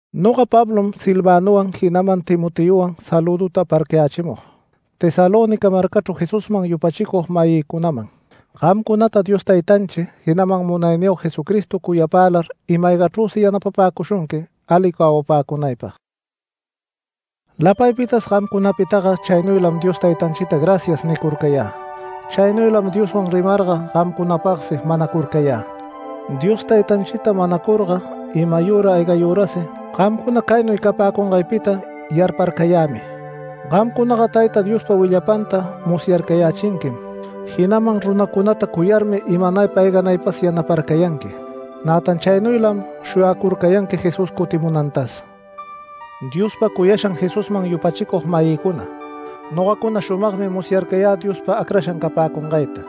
Noga Pablom Silvanowan, jinaman Timoteowan salüduta aparcayächimug Tesalónica marcachru Jesusman yupachicug-mayïcunaman. Gamcunata Dios Taytanchi, jinaman Munayniyog Jesucristo cuyapälar ima-aygachrüsi yanapapäcushunqui ali cawapäcunaypag. Lapaypitas gamcunapitaga chaynuylam Dios Taytanchita “Gracias” nicurcayä. Chaynuylam Dioswan rimarga, gamcunapagsi manacurcayä. Dios Taytanchita manacurga imayüra aygayürasi gamcuna caynuy capäcungaypita yarparcayämi. Gamcunaga Tayta Diospa willapanta musyarcayächinquim, jinaman runacunata cuyarmi imanaypa ayganaypas yanaparcayanqui. Nätan chaynuylam shuyacurcayanqui Jesús cutimunantas. Diospa cuyashan Jesusman yupachicug-mayïcuna, nogacuna shumagmi musyarcayä Diospa acrashan capäcungayta.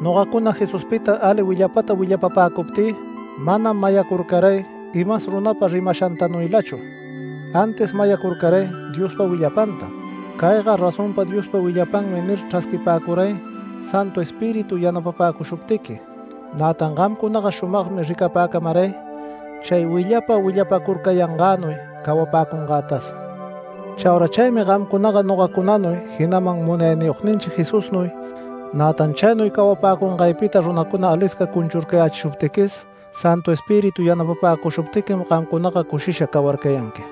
Nogacuna Jesuspita ali willapata willapapäcuptï manam mayacurcaray imas runapa rimashantanuylachu, antis mayacurcaray Diospa willapantam “Cayga razonpa Diospa willapanmi” nir chrasquipäcuray Santu Espíritu yanapapäcushuptiqui. Nätan gamcunaga shumagmi ricapäcamaray chay willapa willapacurcayangänuy cawapäcungätas. Chaura chaymi gamcunaga nogacunanuy jinaman Munayniyogninchi Jesusnuy nä cawarcayanqui. Nätan chaynuy cawapäcungaypita runacuna alisca cunchurcayächishuptiquis, Santu Espíritu yanapäcushuptiquim gamcunaga cushisha cawarcayanqui.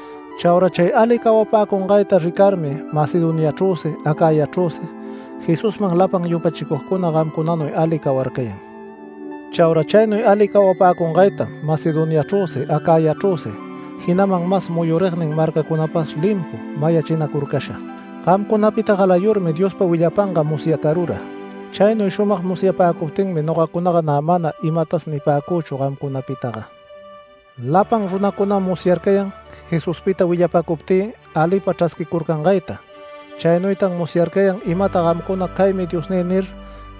Chaura chay ali cawapäcungayta ricarmi Macedoniachrüsi Acayachrüsi Jesusman lapan yupachicugcuna gamcunanuy ali cawarcayan. Chaura chaynuy ali cawapäcungaytam Macedoniachrüsi Acayachrüsi, jinaman mas muyuragnin marcacunapas limpu mayachinacurcasha. Gamcunapita galayurmi Diospa willapanga musyacarura. Chaynuy shumag musyapäcuptinmi nogacunaga nä mana imatas nipäcüchu gamcunapitaga. Lapan runacunam musyarcayan Jesuspita willapäcuptï alipa chrasquicurcangayta. Chaynuytan musyarcayan imata gamcuna “Caymi diosnï” nir,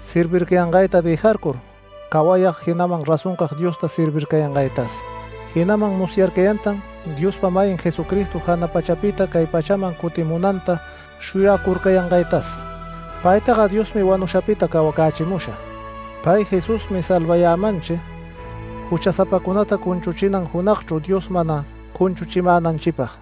servircayangayta dëjarcur, cawayag jinaman razoncag Diosta servircayangaytas. Jinaman musyarcayantan Diospa-mayin Jesucristo jana pachapita cay pachaman cutimunanta shuyacurcayangaytas. Paytaga Diosmi wanushapita cawacächimusha. Pay Jesusmi salvayämanchi juchasapacunata cunchuchinan junagchru Dios mana cunchuchimänanchipag.